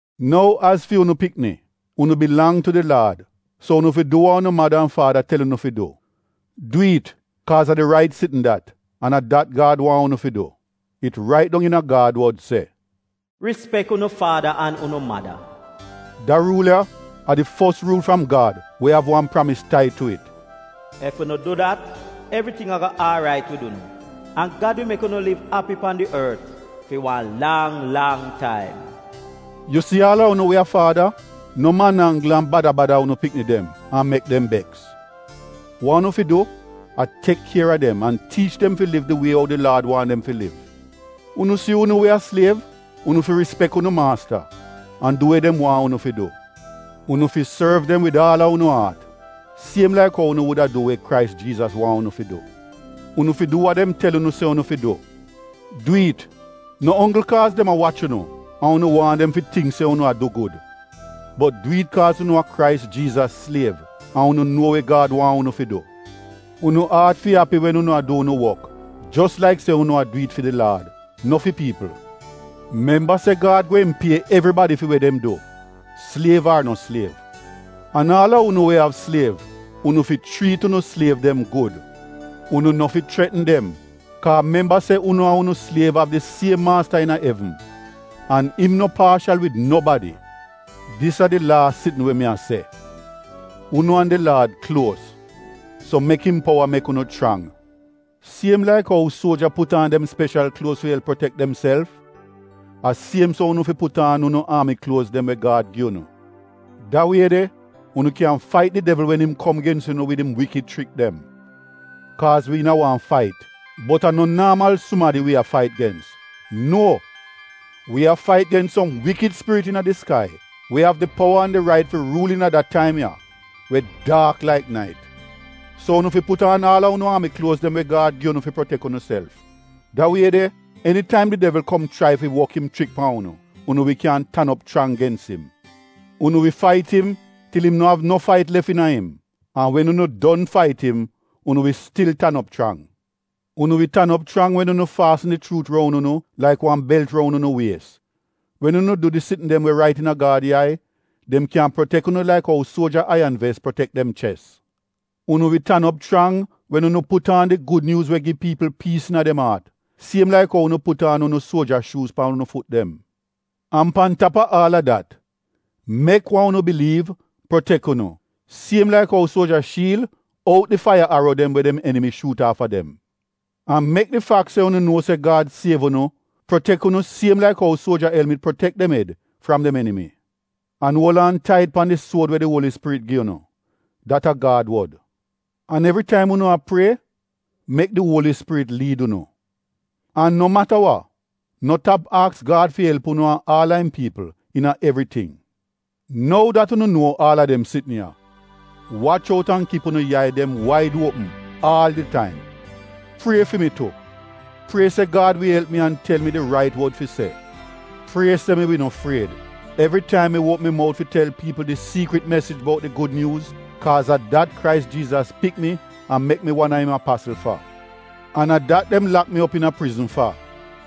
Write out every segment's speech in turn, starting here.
Nou, az fi unu pikni, unu bilang tu di Laad, so unu fi du wa unu mada an faada tel unu fi du. Du it, kaaz a di rait sitn dat, an a dat Gad waahn unu fi du. It rait dong iina Gad wod se, “Rispek unu faada an unu mada.” (Da ruul ya, a di fos ruul fram Gad we av wan pramis tai tu it). “Ef unu du dat, evriting ago aarait wid unu an Gad wi mek unu liv api pan di ort fi wan lang lang taim.” Yu si aal a unu faada, no man-anggl, an bada bada unu pikni dem an mek dem beks. Wa unu fi du a tek kier a dem an tiich dem fi liv di wie ou di Laad waahn dem fi liv. Unu si unu we a sliev, unu fi rispek unu maasta an du we dem waahn unu fi du. Unu fi sorv dem wid aal a unu aat, siem laik ou unu wuda du we Krais Jiizas waahn unu fi du. Unu fi du wa dem tel unu se unu fi du. Du it no onggl kaaz dem a wach unu an unu waahn dem fi tingk se unu a du gud. Bot du it kaaz unu a Krais Jiizas sliev, an unu nuo we Gad waahn unu fi du. Unu aat fi api wen unu a du unu wok, jos laik se unu a du it fi di Laad, no fi piipl. Memba se Gad gweehn pie evribadi fi we dem du, sliev ar no sliev. An aal a unu we av sliev, unu fi chriit unu sliev dem gud. Unu no fi chretn dem, kaa memba se unu an unu sliev av di siem maasta iina evn, an im no paashal wid nobadi. Dis a di laas sitn we mi a se: unu an di Laad kluos, so mek im powa mek unu chrang. Siem laik ou suoja put aan dem speshal kluoz fi elp protek demself, a siem so unu fi put aan unu aami kluoz dem we Gad gi unu. Da wie de, unu kyan fait di devl wen im kom gens unu wid im wikid chrik dem. Kaaz wi iina wan fait, bot a no naamal sumadi wi a fait gens. Nuo! Wi a fait gens som wikid spirit iina di skai we av di powa an di rait fi ruul iina da taim ya we daak laik nait. So unu fi put aan aal a unu aami kluoz dem we Gad gi unu fi protek unuself. Da wie de enitaim di devl kom chrai fi wok im chrik pan unu, unu wi kyan tan op chrang gens im. Unu wi fait im til im no av no fait lef iina im. An wen unu don fait im, unu wi stil tan op chrang. Unu wi tan op chrang wen unu faasn di chuut roun unu laik wan belt roun unu wies, wen unu du di sitn dem we rait iina Gad yai so dem kyan protek unu laik ou suoja aiyan ves protek dem ches. Unu wi tan op chrang wen unu put aan di Gud Nyuuz we gi piipl piis iina dem aat siem laik ou unu put aan unu suoja shuuz pan unu fut dem. An pan tap a aal a dat, mek wa unu biliiv protek unu siem laik ou suoja shiil out di faiya aro dem we dem enimi shuut aafa dem. An mek di fak se unu nuo se Gad siev unu protek unu siem laik ou suoja elmit protek dem ed fram dem enimi. An uol aan tait pan di suod we di Uoli Spirit gi unu, dat a Gad wod. An evri taim unu a prie, mek di Uoli Spirit liid unu. An no mata wa, no tap aks Gad fi elp unu an aal a im piipl iina evriting. Nou dat unu nuo aal a dem sitn ya, wach out an kip unu yai dem waid uopm aal di taim. Prie fi mi tu. Prie se Gad wi elp mi an tel mi di rait wod fi se. Prie se mi wi no fried evri taim mi uopm mi mout fi tel piipl di siikrit mesij bout di Gud Nyuuz, kaaz a dat Krais Jiizas pik mi an mek mi wan a im apasl fa. An a dat dem lak mi op iina prizn fa.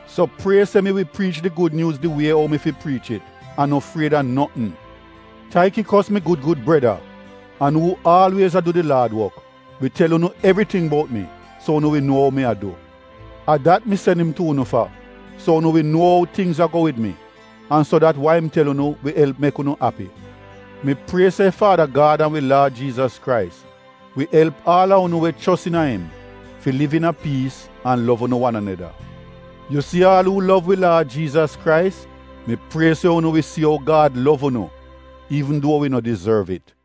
So prie se mi wi priich di Gud Nyuuz di wie ou mi fi priich it an no fried a notn. Taikikos mi gud gud breda an paadi iina di Laad wok, wi tel unu evriting bout mi so unu wi nuo ou mi a du. A dat mi sen im tu unu fa, so unu wi nuo ou tingz a go wid wi, an so dat wa im tel unu wi elp mek unu api. Mi prie se Faada Gad an wi Laad Jiizas Krais wi elp aal a unu we chos iina im liv iina piis an lov unu wan aneda. Yu si aal uu lov wi Laad Jiizas Krais, mi prie se unu wi si ou Gad lov unu, iivn duo wi no dizorv it.